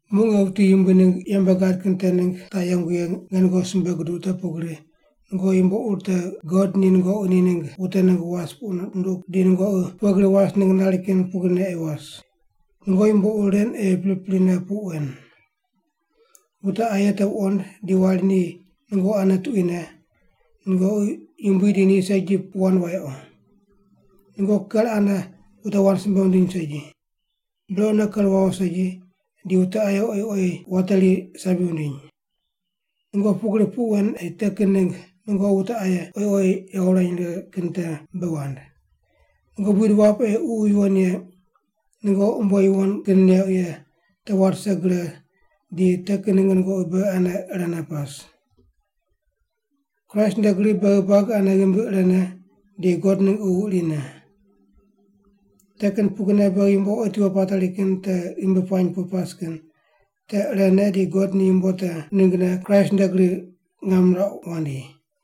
Muq nge wuti Yumbui ningg yembe gad kin te ningg taq yengu ye nge nungoqi simbe guduq te pugri nungoqi yumbo ur te God ni nungoqi ni ningg wute ningg was puq nunduq di nungoqi pughe gri was ningg nari kin pugrine ei was. Nungoqi yumbo ur ren ei priprine puq wen: Wute aye te wuqond di wari ni nungoqi ane tuquine, nungoqi yumbui di ni segi puq wand wayequ. Nungoqi ker ane wute wand simbe wundiny segi. Brequne ker wawo segi di wute aye oyi oyi wateri sabi wundiny. Nungoqi pugri puq wen ei te kin ningg nungoqi wute aye oyi oyi yawo wurany righe kin te bei wand. Nungoqi buid wap ei Ququ Yuwon Ye nungoqi umbo yuwon kin neuq ye te wat rise gre di te kin ningg nungoqi beghi ane irene pas. Kraist nde gri beghi buagi ane ghimbi irene di God ningg Ququ irine. Te kin pugrine beghi yumbo otiwo pateri kin te ghimbi puany pu pas kin te irene di God ni yumbo te ninggne Kraist nde gri ngam nirauq wandi.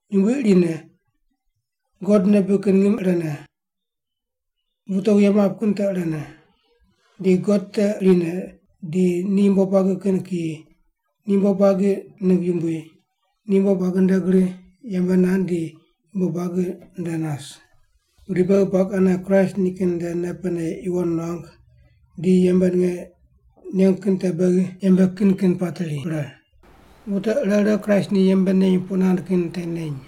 Yumbui irine, God nei bibig kin ngim irene, wute wuye map kin te irene, di God te irine di ni yumbo buagi kin kiyi, ni yumbo buagi ningg yumbui, ni yumbo buagi nde gri yembe nand di yumbo buagi nde nas. Pudi beghi buagi ane Kraist nikin nde nei pene yuwon nuangu di yembe ninge nengu kin te beghi yembe kin kin pateri pre. Wute ire ire Kraist ni yembe neny puq nand kin te neny.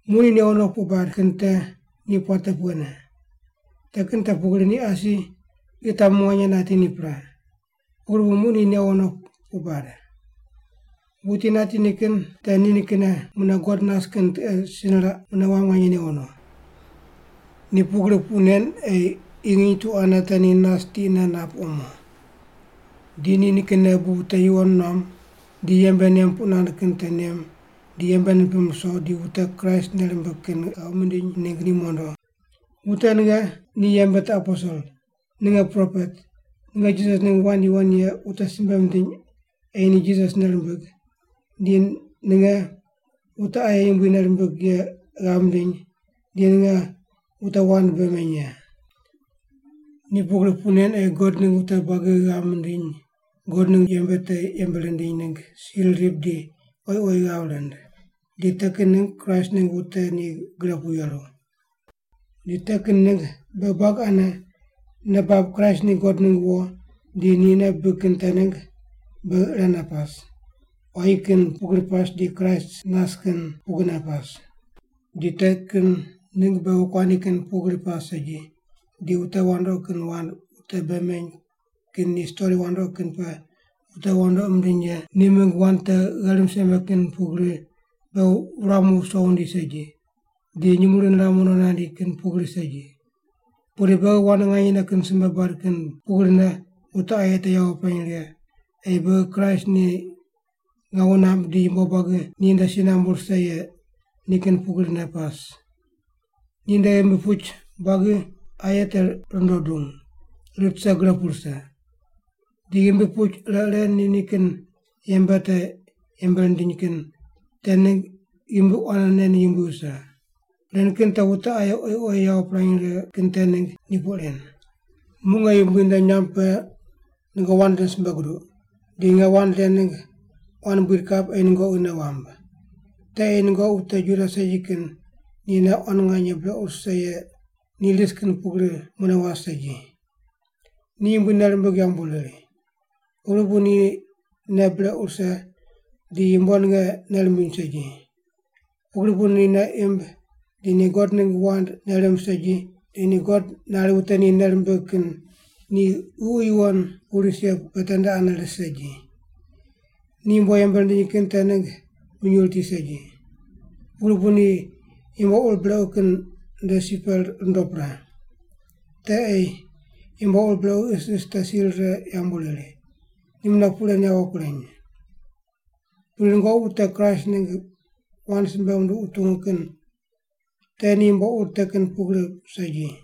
Muq ni newo no puq bad kin te ni puate pughene? Te kin te pugri ni asi qi tamu nganye nati ni pre, pugri bu muq ni newo no puq bad. Wuti nati ni kin te nikinne mune God nas kin tiqe si niraq mune wam nganye newo no. Ni pugri puq nen ei qi nginy tu ane te ni nas tiqne nap omo. Di ni nikinne bu wute yuwon nuam di yembe nem puq nand kin te nem di yembe nipim ruso di wute Kraist nei rimbig kin ghav mindiny ningg ni mondo. Wute ninge ni yembe te aposel, ninge propet, ninge Jisas ningg wand yuwon ye wute simbe mindiny ei ni Jisas nei rimbig, di ninge wute aye Yumbui nei rimbig ye ghav mindiny di ninge wute wand bei meny ye. Ni pugri puq nen ei God ningg wute buagi ghav mindiny God ningg yembe te yembe rindiny ningg sir rip di oyi oyi ghav rind, di te kin ningg Kraist ningg wute ni gre pu yeru. Di te kin ningg beghi buagi ane nei bab Kraist ni God ningg wo di ni nei bibig kin te ningg beghi irene pas, quayi kin pugri pas di Kraist nas kin pugrine pas. Di te kin ningg beghi wokuandi kin pugri pas segi, di wute wandoqi kin wand wute bei meny kin ni stori wandoqi kin pe wute wandoqi mindiny ye ni mingg wand te gherim seme kin pugri beghi wuramu wuso wundi segi, di nyumurighi niramu no nandi kin pugri segi. Pudi beghi wand nganyene kin simbe bad kin pugrine wute aye te yawo pirany righe ei beghi Kraist ni ngawu namb di yumbo buagi ninde si nambu rise ye ni kin pugrine pas. Ninde ghimbi puch buagi aye te rundo dung, rit rise gre pu rise. Di ghimbi puch ire ire ni nikin yembe te yembe rindiny kin te ningg ghimbi quanene ni yumbui wuse. Ren kin te wute aye oyi oyi yawo pirany righe kin te ningg ni puq ren. Muq nge Yumbui nde nyamb pe nungoqi wand ren simbe guduq, di nge wand ren ningg quan buid kap ei nungoqi nei wamb. Te ei nungoqi wute Juda segi kin ni nei quan nganye brequ rise ye ni ris kin pugri mune was segi. Ni Yumbui nei rimbig yambu riri. Pugri bu ni nei brequ rise di yumbo ninge nei rimbiny segi. Pugri bu ni nei imb di ni God ningg wand nei rimb segi di ni God nari wute ni nei rimbig kin ni ququ yuwon pu ris ye pe tende ane ris segi. Ni yumbo yembe rindiny kin te ningg minyuw riti segi. Pugri bu ni yumbo ur brequ kin nde si pe rundo pre. Te ei ni yumbo ur brequ isis te si rire yambu riri. Ni mune puq ren yawo kureny. Pudi nungoqi wute Kraist ningg wand simbe munduq wutungu kin te ni yumbo ur te kin pugri segi.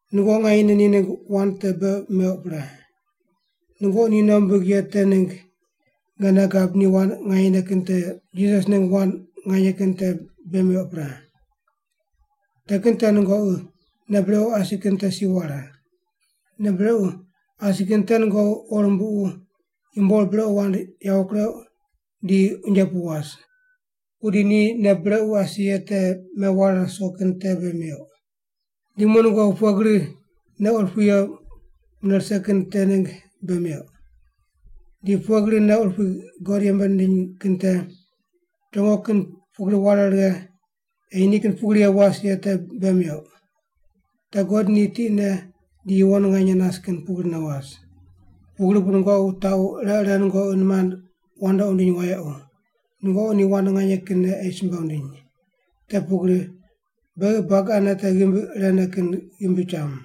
Nungoqi nganyene ni ningg wand te bei meuq pre. Nungoqi ni nei wumbig ye te ningg nge nei gab ni wand nganyene kin te Jisas ningg wand nganye kin te bei meuq pre. Te kin te nungoqi nei brequ asi kin te si ware. Nei brequ asi kin te nungoqi qo rumbuqu yumbo ur brequ wand yawo kureuq di unje pu was. Pudi ni nungoqi nei brequ asi ye te meware ruso kin te bei meuq. Di muq nungoqi pughe gri nei urupui ye mune rise kin te ningg bei meuq. Di pughe gri nei urupui God yembe nindiny kin te chongo kin pugri ware righe ei ni kin pugri ye was ye te bei meuq. Te God ni tiqne di yuwon nganye nas kin pugrine was. Pugri bu nungoqi wutaqu ire ire nungoqi nimand wandoqi wundiny wayequ, nungoqi ni wand nganye kinne ei simbe wundiny, te pugri beghi buagi ane te ghimbi irene kin ghimbi cham.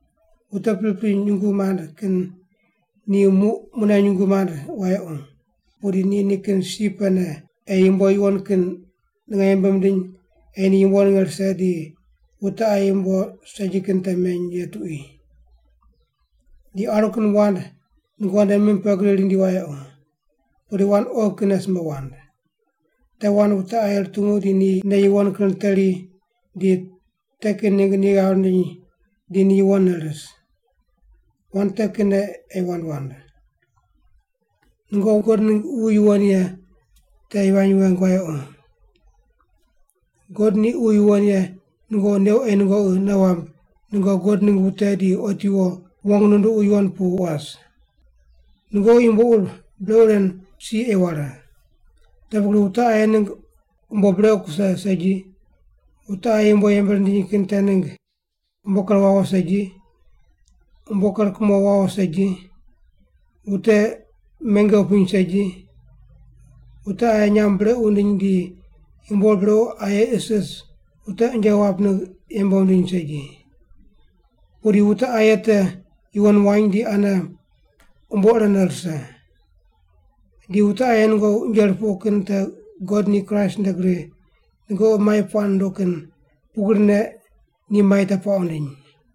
Wute pripri nyungu mand kin ni muq mune nyungu mand wayequ. Pudi ni nikin si pene ei yumbo yuwon kin ninge yembe mindiny ei ni yumbo ninge rise di wute aye yumbo segi kin te meny ye tuqui. Di aru kin wand nungoqi nde mim pe gri rindi wayequ, pudi wand oghi kinne simbe wand. Te wand wute aye rutungu di ni nei yuwon kin riteri di te kin ningg ni ghav rindiny di ni yuwonne ris. Wand te kinne ei wand wand. Nungoqi God ningg Ququ Yuwon Ye te yivany weng wayequ. God ni Ququ Yuwon Ye nungoqi neuq ei nungoqi nei wamb nungoqi God ningg wute di otiwo wong nunduqu yuwon pu was. Nungoqi yumbo ur brequ ren si ei ware. Te pugri wute aye ningg umbo brequ kuse segi, wute aye yumbo yembe rindiny kin te ningg umbo ker wawo segi, umbo ker kumo wawo segi, wute menge wupiny segi, wute aye nyamb brequ wundiny di yumbo ur brequ aye isis wute unje wap ningg yembe wundiny segi. Pudi wute aye te yuwon wany di ane umbo irene rise. Di wute aye nungoqi unje rupuqu kin te God ni Kraist nde gri nungoqi mai puaq nunduq kin pugrine ni mai te puaq wundiny.